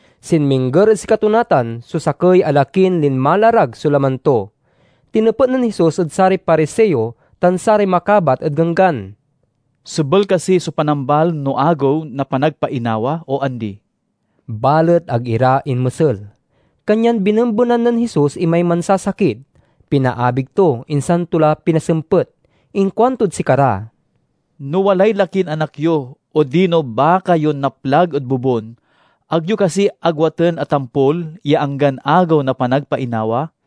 Sinmingger ed sikato natan so sakey a lakin linmalarag so laman to. Tinepet nen Jesus ed saray Pariseo tan saray makabat ed Ganggan, "Sebel kasi so panambal no Agew na Panagpainawa o andi?" Balet ag ira inmesel, kanyan binembenan nen Jesus imay mansasakit, pinaabig to, insan to la pinasempet. Inkuantod sikara, "No walay lakin anak yo odino baka yon naplag ed bobun, ag yo kasi agwaten a tampol ya anggan Agew na Panagpainawa?"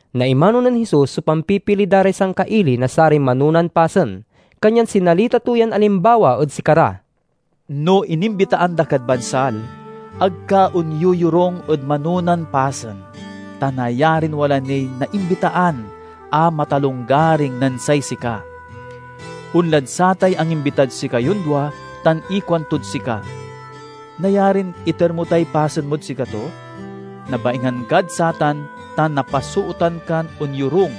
Naimano nen Jesus so pampipili da ray sangkaili na saray manonan pasen, kanyan sinalita to yan alimbawa ed sikara, "No inimbitaan da kad bansal, ag ka onyoyorung ed manonan pasen, ta nayarin wala niy naimbitaan a matalonggaring nen say sika. Onlad satay angimbitad sikayon dua tan ikuantod sika, 'Nayarin iter mo tay pasen mod sikato?' Nabaingan kad satan tan napasootan kan onyorung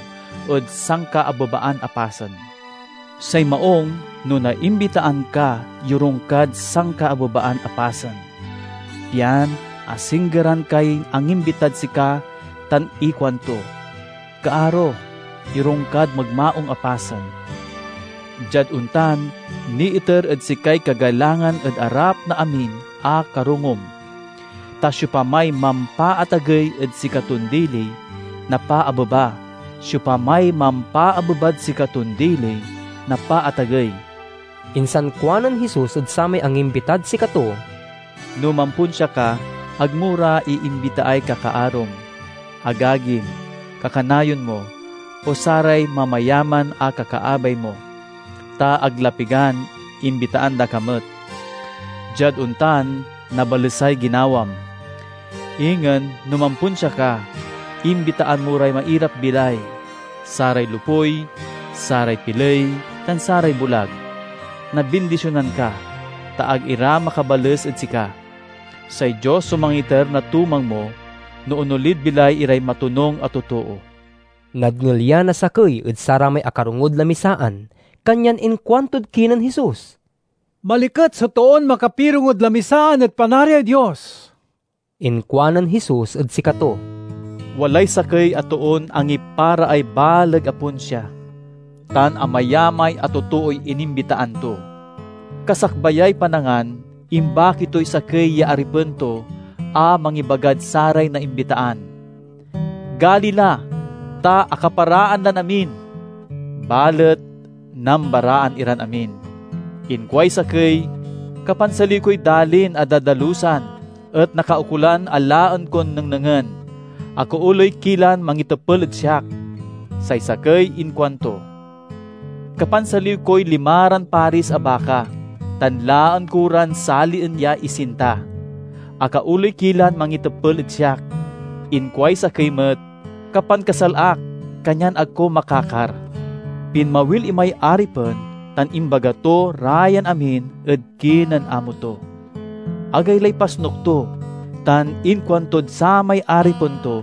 ed sankaabebaan a pasen. Say maung, no naimbitaan ka yorung kad sankaabebaan a pasen, pian asinggeran kay angimbitad sika tan ikuanto, 'Kaaro, yorung kad magmaung a pasen.' Diad ontan, niiter ed sikay kagalangan ed arap na amin a karongom. Ta siopamay mampaatagey ed sikaton dili, napaabeba; siopamay mampaabebad sikaton dili, napaatagey." Insan kuanen Jesus ed samay angimbitad sikato, "No mamponsia ka, ag mo ra iimbitaay kakaarom, agagim, kakanayon mo, o saray mamayaman a kakaabay mo, ta ag la pigan imbitaan da ka met. Diad ontan, nabalesay ginawam. Ingen, no mamponsia ka, imbitaan mo ray mairap-bilay, saray lopuy, saray piley, tan saray bulag. Nabindisionan ka, ta ag ira makabales ed sika. Say Dios so mangiter na tumang mo, no onolid bilay iray matonung a totoo." Nadngel ya na sakey ed saramay akarongod lamisaan, kanyan inkuantod kinen Jesus, "Maliket so toon makapirongod lamisaan ed Panariay Dios!" Inkuanen Jesus ed sikato, "Walay sakey a toon angiparaay baleg a ponsia, tan amayamay a totooy inimbitaan to. Kasakbayay panangan, imbaki toy sakey ya aripen to a mangibagad saray naimbitaan, 'Gali la, ta akaparaan lan amin!' Balet nambaraan iran amin. Inkuay sakey, 'Kapansaliw koy dalin a dadalusan, et nakaukolan a laen kon nengnengen. Akaoley ki lan mangitepel ed siak.' Say sakey inkuanto, 'Kapansaliw koy limaran paris a baka, tan laen ko ran salien ya isinta. Akaoley ki lan mangitepel ed siak.' Inkuay sakey met, 'Kapankasal ak, kanyan ag ko makakar.' Pinmawil imay aripen tan imbaga to ra yan amin ed kinen amo to. Agaylay pasnuk to, tan inkuantod samay aripen to,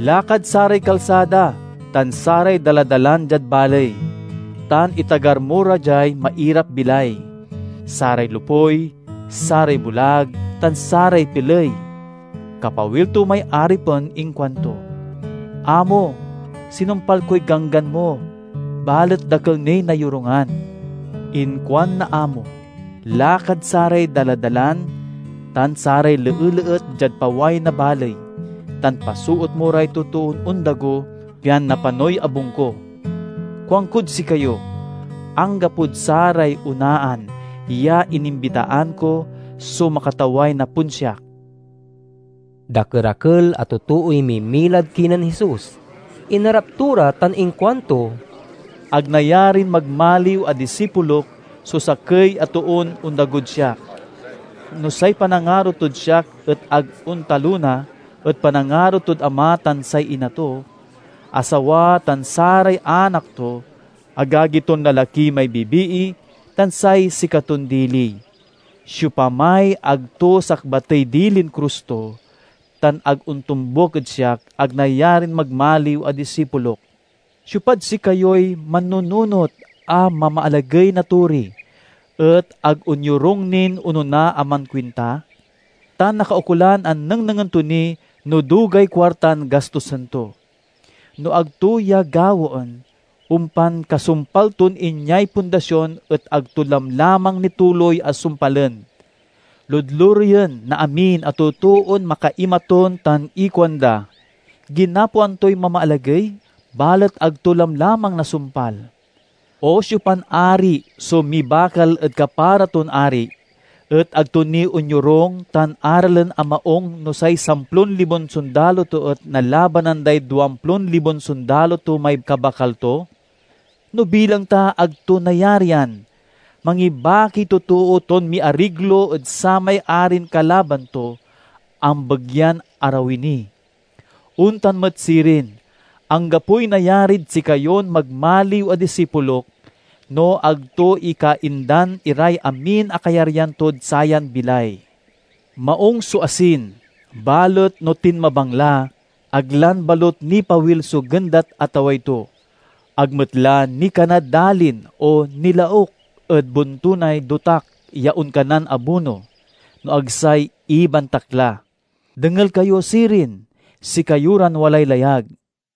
'Lakad saray kalsada tan saray daladalan diad baley, tan itagar mo ra diay mairap-bilay, saray lopuy, saray bulag, tan saray piley!' Kapawil to may aripen inkuanto, 'Amo, sinumpal koy ganggan mo, balet dakel niy nayorungan.' Inkuan na amo, 'Lakad saray daladalan tan saray leeleet diad paway na baley, tan pasoot mo ray totoon ondago, pian napanoy abung ko. Kuankod sikayo: anggapod saray onaan ya inimbitaan ko so makataway na ponsiak!'" Dakerakel a totooy mimilad kinen Jesus. Inarap to ra tan inkuanto, "Ag nayarin magmaliw a disipulok so sakey a toon ondagod siak, no say panangaro tod, siak et ag ontalona ed panangaro tod ama tan say ina to, asawa tan saray anak to, agagi ton lalaki may bibii, tan say sikaton dili. Siopamay ag to sakbatey dilin krus to tan ag ontombuk ed siak, ag nayarin magmaliw a disipulok. Siopad sikayoy mannununot a mamaalagey na tori et ag onyorung nin onona a mankuinta? Ta nakaukolan a nengnengen to ni no dugay kuartan gastosen to. No ag to ya gawaen, ompan kasumpal ton inyay pundasion et ag to lamlamang nituloy a sumpalen. Ludlureyen na amin a totoon makaimatun tan ikuanda, 'Ginapoan toy mamaalagey, balet ag to lamlamang nasumpal!' O siopan ari so mibakal ed kapara ton ari, et ag to ni onyorung tan aralen a maung no say samplon libon sondalo to et nalabanan day duamplon libon sondalo to may kabakal to? No bilang ta ag to nayarian, mangibakiy totoo ton miariglo ed samay arin kalaban to, ambegyan arawi ni. Ontan met sirin, anggapoy nayarid sikayon magmaliw a disipulok no ag to ikaindan iray amin a kayaryan tod sayan bilay." "Maung so asin, balet no tinmabang la, ag lan balut nipawil so gendat a taway to. Ag met la nikanad dalin o nilauk ed bontunay dotak ya onkanan abuno, no ag say ibantak la. Dengel kayo, sirin, sikayo ran walay layag!"